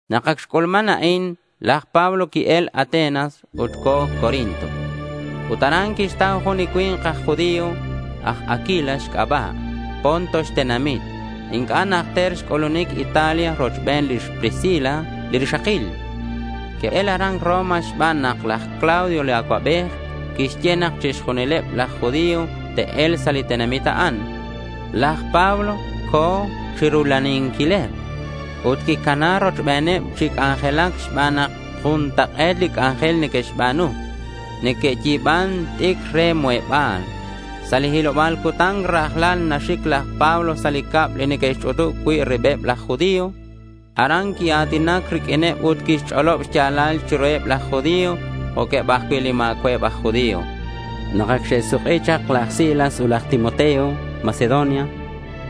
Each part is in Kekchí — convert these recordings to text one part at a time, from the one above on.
Nak ac xc'ulman a'in, laj Pablo qui-el Atenas. Ut co̱ Corinto. Ut aran quixtau jun li cui̱nk aj judío. Aj Aquila xc'aba'. Ponto xtenamit. Inc'a' najter xc'ulunic Italia rochben lix Priscila li rixakil. Que'el aran Roma xban nak laj Claudio li Acuabej quixye nak chixjunileb laj judío te'e̱lk sa' li tenamit a'an. Laj Pablo co̱ chirula'anquileb. Ut quicana rochbeneb chi c'anjelac xban nak juntak'e̱t li c'anjel neque'xba̱nu. Neque'yi̱ban t'icr re muheba̱l. Sa' li hiloba̱l cutan rajlal naxic laj Pablo sa' li cab li neque'xch'utub cui' ribeb laj Judío. Aran quia̱tinac riq'uineb ut quixch'olob xya̱lal chiruheb laj judío jo'queb ajcui' li ma̱cua'eb aj judío. Nak ac xe'suk'i chak laj Silas ut laj Timoteo Macedonia,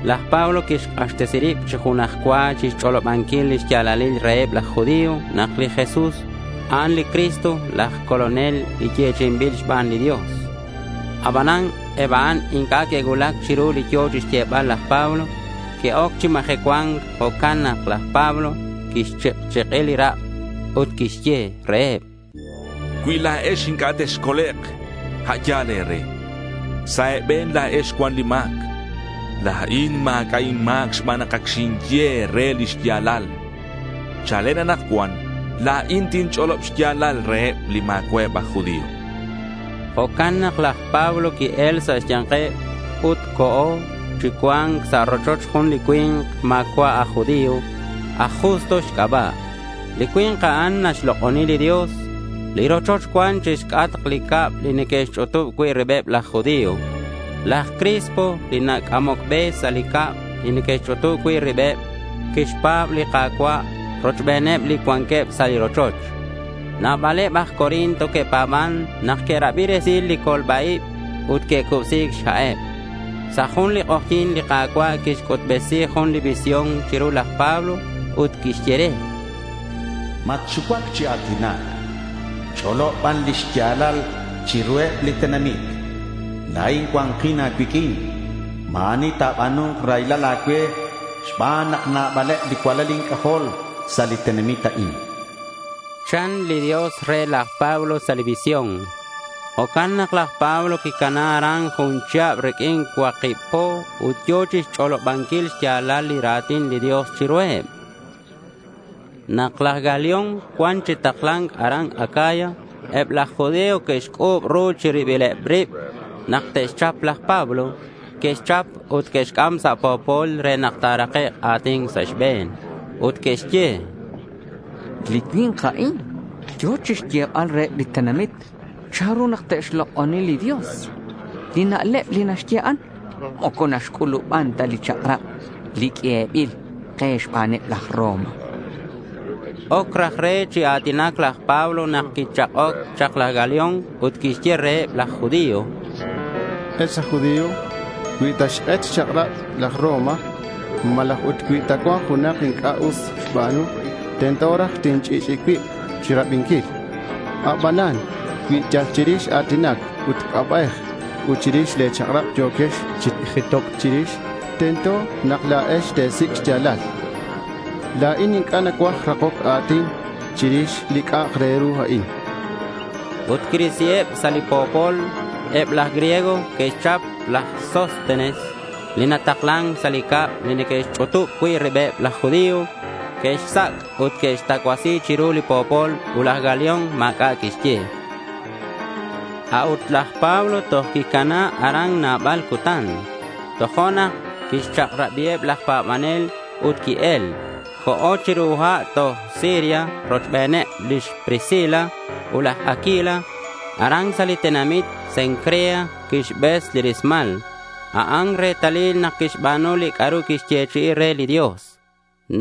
laj Pablo quixk'axtesi rib chi junaj cua chixch'olobanquil lix ya̱lal reheb laj judío nak li Jesús, a'an li Cristo, laj Colonel li yechi'inbil xban li Dios. Abanan eb a'an inc'a' que'cuulac chiru li yo̱ chixyebal laj Pablo. Que'oc chi majecua̱nc. Jo'can nak laj Pablo quixchik'chik'i li rak' ut quixye reheb: —Cui la̱ex inc'a' texcolek', a' yal e̱re. Sa' e̱be̱n la̱ex cuan li ma̱c. La̱in ma̱c'a' inma̱c xban nak ac xinye e̱re li xya̱lal. Chalen anakcuan la̱in tinch'olob xya̱lal reheb li ma̱cua'eb aj judío, chan. Jo'can nak laj Pablo qui-el sa' xya̱nkeb ut co̱ chi cua̱nc sa' rochoch jun li cui̱nk ma̱cua' aj judío. Aj Justo xc'aba'. Li cui̱nk a'an naxlok'oni li Dios. Li rochoch cuan chixc'atk li cab li neque'xch'utub cui' ribeb laj judío. Laj Crispo, li nac'amoc be sa' li cab li neque'xch'utub cui' ribeb, quixpa̱b Li Ka̱cua' rochbeneb li cuanqueb sa' li rochoch. Nabaleb aj Corinto que'pa̱ban nak que'rabi resil li colba-ib. Ut que'cubsi̱c xha'eb. Sa' jun li k'ojyi̱n li Ka̱cua' quixc'utbesi jun li visión chiru laj Pablo ut quixye re: —Matxucuac chi a̱tinac. Ch'olob ban li xya̱lal chiruheb li tenamit. La̱in cua̱nkin a̱cuiq'uin. Ma̱ ani ta̱ba̱nu̱nk raylal a̱cue xban nak nabaleb li cualal inc'ajol sa' li tenamit a'in, chan li Dios re laj Pablo sa' li visión. Jo'can nak laj Pablo quicana aran jun chihab riq'uin cuakib po ut yo̱ chixch'olobanquil xya̱lal li ra̱tin li Dios chiruheb. Nak laj Galión cua̱nk chi takla̱nc aran Acaya, eb laj judío que'xc'u̱b ru chi ribileb rib nak te'xchap laj Pablo. Que'xchap ut que'xc'am sa' po̱pol re nak ta̱rakek' a̱tin sa' xbe̱n. Ut que'xye: —Li cui̱nk a'in yo̱ chixyebal reheb li tenamit chanru nak te'xlok'oni li Dios. Li na'leb li naxye a'an, moco naxc'u̱luban ta li chak'rab, li q'uebil ke xbaneb laj Roma, chanqueb. Oc raj re chi a̱tinac laj Pablo nak quichak'oc chak laj Galión ut quixye reheb laj judío: —Ex aj judío, cui ta xk'et xchak'rabeb laj Roma malaj ut cui ta cuan junak inc'a' us xba̱nu, tento raj tinch'i'ch'i'i cuib che̱rabinquil. Abanan cui yal chirix a̱tinac ut c'aba'ej ut chirix le̱ chak'rab yo̱quex chi jitoc chirix, tento nak la̱ex te̱sic' xya̱lal. La̱in inc'a' nacuaj rakoc a̱tin chirix li c'a'ak re ru a'in, chan. Ut quirisiheb sa' li po̱pol. Eb laj griego que'xchap laj Sóstenes li nataklan sa' li cab li neque'xch'utub cui' ribeb laj judío. Que'xsac' ut que'xtacuasi chiru li po̱pol ut laj Galión ma̱c'a' quixye. A'ut laj Pablo toj quicana aran nabal cutan. Tojo'nak quixchak'rabiheb laj pa̱banel ut qui-el. Co̱ chiru ha' toj Siria rochbeneb lix Priscila ut laj Aquila. Aran sa' li tenamit Cencrea quixbes li rismal. A'an retalil nak quixba̱nu li c'a'ru quixyechi'i re li Dios.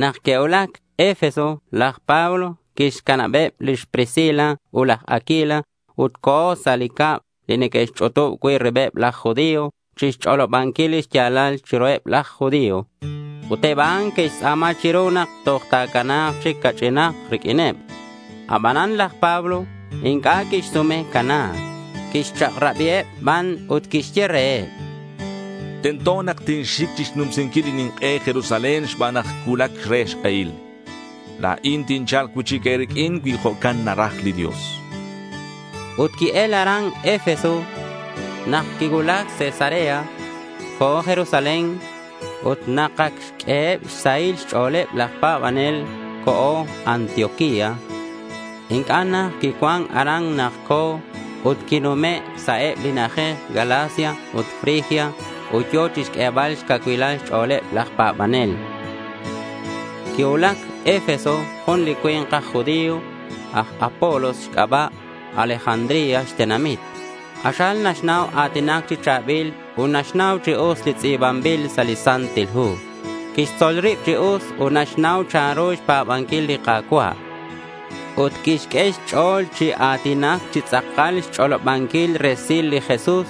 Nak que'cuulac Efeso laj Pablo quixcanabeb lix Priscila ut laj Aquila ut co̱ sa' li cab li neque'xch'utub cui' ribeb laj judío chixch'olobanquil lix ya̱lal chiruheb laj judío. Ut eb a'an que'xtz'a̱ma chiru nak toj ta̱cana̱k chic ca'ch'inak riq'uineb. Abanan laj Pablo inc'a' quixsume cana̱c. Quixchak'rabiheb ban ut quixye reheb: —Tento nak tinxic chixnumsinquil li nink'e Jerusalén xban nak cuulac re xk'ehil. La̱in tincha̱lk cui'chic e̱riq'uin cui jo'can naraj li Dios, chan. Ut qui-el aran Efeso. Nak quicuulac Cesarea, co̱ Jerusalén. Ut nak ac xq'ueheb xsahil xch'o̱leb laj pa̱banel, co̱ Antioquía. Inc'a' najt quicuan aran nak co̱ ut quinume' sa' eb li na'ajej Galacia ut Frigia ut yo̱ chixq'uebal xcacuilal xch'o̱leb laj pa̱banel. Quicuulac Efeso jun li cui̱nk aj judío, aj Apolos xc'aba'. Alejandría xtenamit. K'axal naxnau a̱tinac chi cha̱bil ut naxnau chi us li tz'i̱banbil sa' li Santil Hu. Quixtzol rib chi us ut naxnau chanru xpa̱banquil li Ka̱cua'. Ut quixq'ue xch'o̱l chi a̱tinac chi tz'akal xch'olobanquil resil li Jesús,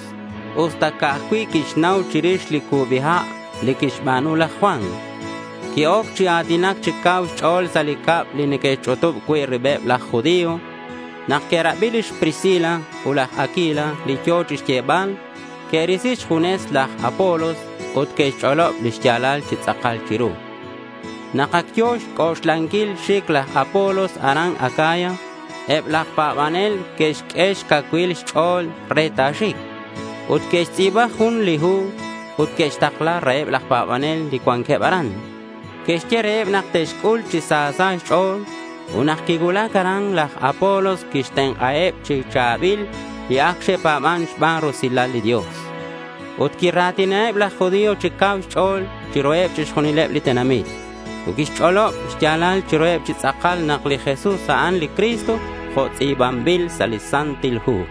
usta ca'aj cui' quixnau chirix li cubi ha' li quixba̱nu laj Juan. Qui-oc chi a̱tinac chi cau xch'o̱l sa' li cab li neque'xch'utub cui' ribeb laj judío. Nak que'rabi lix Priscila ut laj Aquila li yo̱ chixyebal, que'risi xjunes laj Apolos ut que'xch'olob li xya̱lal chi tz'akal chiru. Nak ac yo̱ xc'oxlanquil xic laj Apolos aran Acaya, eb laj pa̱banel que'xq'ue xcacuil xch'o̱l re ta̱xic. Ut que'xtz'i̱ba jun li hu ut que'xtakla reheb laj pa̱banel li cuanqueb aran. Que'xye reheb nak te'xc'ul chi sa sa' xch'o̱l. Ut nak quicuulac aran, laj Apolos quixtenk'aheb chi cha̱bil li ac xe'pa̱ban xban rusilal li Dios. Ut quira̱tinaheb laj judío chi cau xch'o̱l chiruheb chixjunileb li tenamit. Ut quixch'olob xya̱lal chiruheb chi tz'akal nak li Jesús, a'an li Cristo, jo' tz'i̱banbil sa' li Santil Hu.